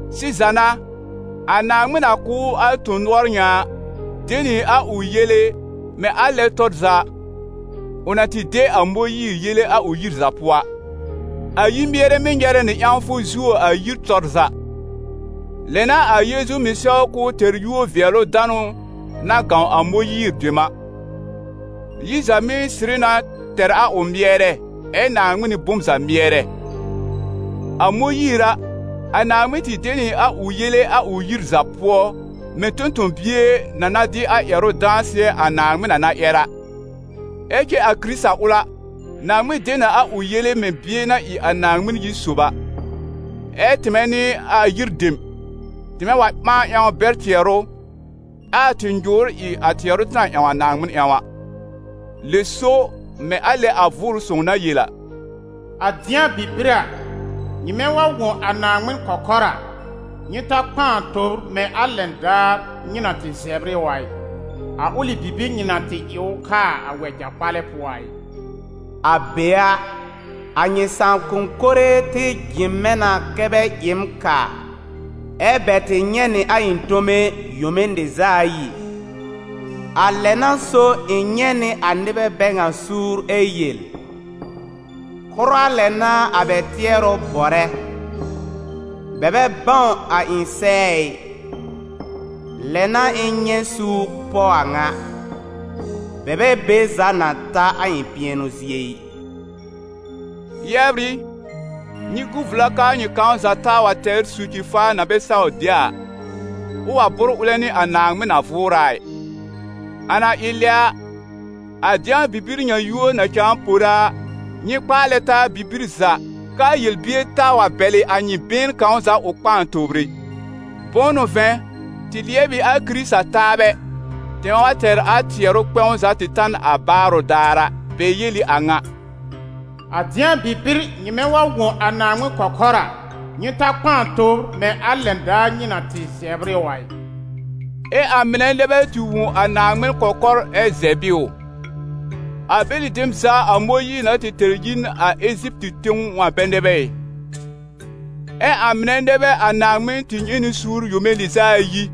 Sɩza n'a, a Naaŋmɩn na kʋ̀ ʋ a tõ-nʋɔr ŋa a, de nɩ a ʋ yele, mɛ̃ a lɛ tɔr za ʋ na tɩ de a Mõyiir yele a ʋ yir za pʋɔ a. A yir-mɩɛrɛ mɩ́ nyɛrɛ nɩ ƴãwfʋ zuo a yir tɔr za. Lɛ n'a a Yeezu mɩ̀ sɛw k'ʋʋ tɛr yúor-vɩɛlʋ-danʋ na gãw a Mõyiir dem a. Yir za mɩ́ sɩrɩ na tɛr a ʋ mɩɛrɛ, ɛ Naaŋmɩn n'ɩ bom za mɩɛrɛ. A Mõyiir a, a Naaŋmɩn tɩ de nɩ a ʋ yele a ʋ yir za pʋɔ mɛ̃ tõ-tõ-bie na na dɩ a ƴɛrʋ dãsɩɛ, a Naaŋmɩn na na ƴɛr a. Ɛ cɛ a Kɩrɩta ʋl a, Naaŋmɩn de nɩ a ʋ yele mɛ̃ Bie na ɩ a Naaŋmɩn yir sob a. Ɛ tɩmɛ n'ɩ a yir dem, tɩmɛ wa ɓãa ƴãw bɛr tɩɛrʋ, ɛ a tɩ nyʋ̀ʋ́r ɩ a tɩɛrʋ tɩ na ƴãw a Naaŋmɩn ƴãw a. Lɛ so, mɛ̃ a lɛ a Vʋʋrʋ Sõw na yel a: «A dɩ̃a bibir a, nyɩmɛ wa wõ a Naaŋmɩn kɔkɔr a, nyɩ ta kpãa tobr mɛ̃ a lɛn daar nyɩ na tɩ zɛbr ɩ ʋ a ɩ, a ʋlɩ bibir nyɩ na tɩ ɩ ʋ kaa a wɛja-kpalɛ pʋɔ a ɩ. A be a, a nyɩ sãakʋm mɩnɛ tɩ jɩ̃ mɛ̃ na kɛ́ bɛ ɩ m kaa, ɛ́ bɛ tɩ nyɛ̃ nɩ a ɩ̃ tome yome lɩz'a ayi. A lɛ n'a so ɩ̃ nyɛ̃ nɩ a nɩbɛ bɛ ŋa suur ɛ yel: ‹Kʋra lɛ n'a a bɛ tɩɛrʋ bɔrɛ, bɛ bɛ bãw a ɩ̃ sɛɛ ɩ.› Lɛ n'a ɩ̃ nyɛ̃ suur pɔ a ŋa: bɛ bɛ be za na ta a ɩ̃ pɩɛnʋ zie ɩ!» Yɛbr ɩ, nyɩ gu vla k'aa nyɩ kãw za taa wa tɛr soci-faa na bɛ saw de a, ʋ wa bʋ́r ʋlɛ nɩ a Naaŋmɩn na vʋʋrɛ a ɩ. A na ɩ lɛ a, a «Dɩ̃a bibir» ŋa yúor na cãa pore a, nyɩ kpaalɛ taa bibir za, k'aa yel-bier taa wa bɛlɩ a nyɩ been kãw za ʋ kpãa tobr ɛ. Bʋ̃ʋ n'ʋ vɛ̃, tɩ lɩɛb ɩ a Kɩrɩta taabɛ, tɩmɛ wa tɛr a tɩ tɩɛrʋ kpɛ̃w za tɩ ta n a baarʋ daar a. Bɛ yel ɩ a ŋa: «A dɩ̃a bibir nyɩmɛ wa wõ a Naaŋmɩn kɔkɔr a, nyɩ ta kpãa tobr mɛ̃ a lɛn daar nyɩ na tɩ zɛbr ɩ ʋ a ɩ.» Ɛ cɛ ã-mɩnɛ nɛ bɛ tɩ wõ a Naaŋmɩn kɔkɔr ɛ zɛb ɩ ʋ? A bɛlɩ dem za a Mõyiir na tɩ tɛr yi n a Eziptɩ tẽw a bɛ nɛ bɛ ɩ? Ɛ ã-mɩnɛ nɛ bɛ a Naaŋmɩn tɩ nyɛ̃ nɩ suur yome lɩz'a ayi?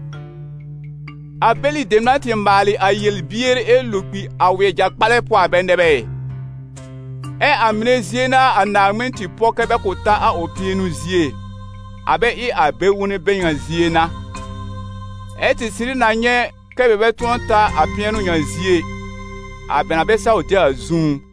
A bɛlɩ dem na tɩ maalɩ a yel-bier ɛ lo kpi a wɛja-kpalɛ pʋɔ a bɛ nɛ bɛ ɩ? Ɛ ã-mɩnɛ zie n'a a Naaŋmɩn tɩ pɔ kɛ́ bɛ kʋ̃ ta a ʋ pɩɛnʋ zie, a bɛ ɩ a bɛ-wonbɛ bɛ ŋa zie n'a? Ɛ tɩ sɩrɩ na nyɛ̃ kɛ́ bɛ bɛ tʋ̃ɔ ta a pɩɛnʋ ŋa zie ɩ, a bɛ na bɛ saw de a zũú.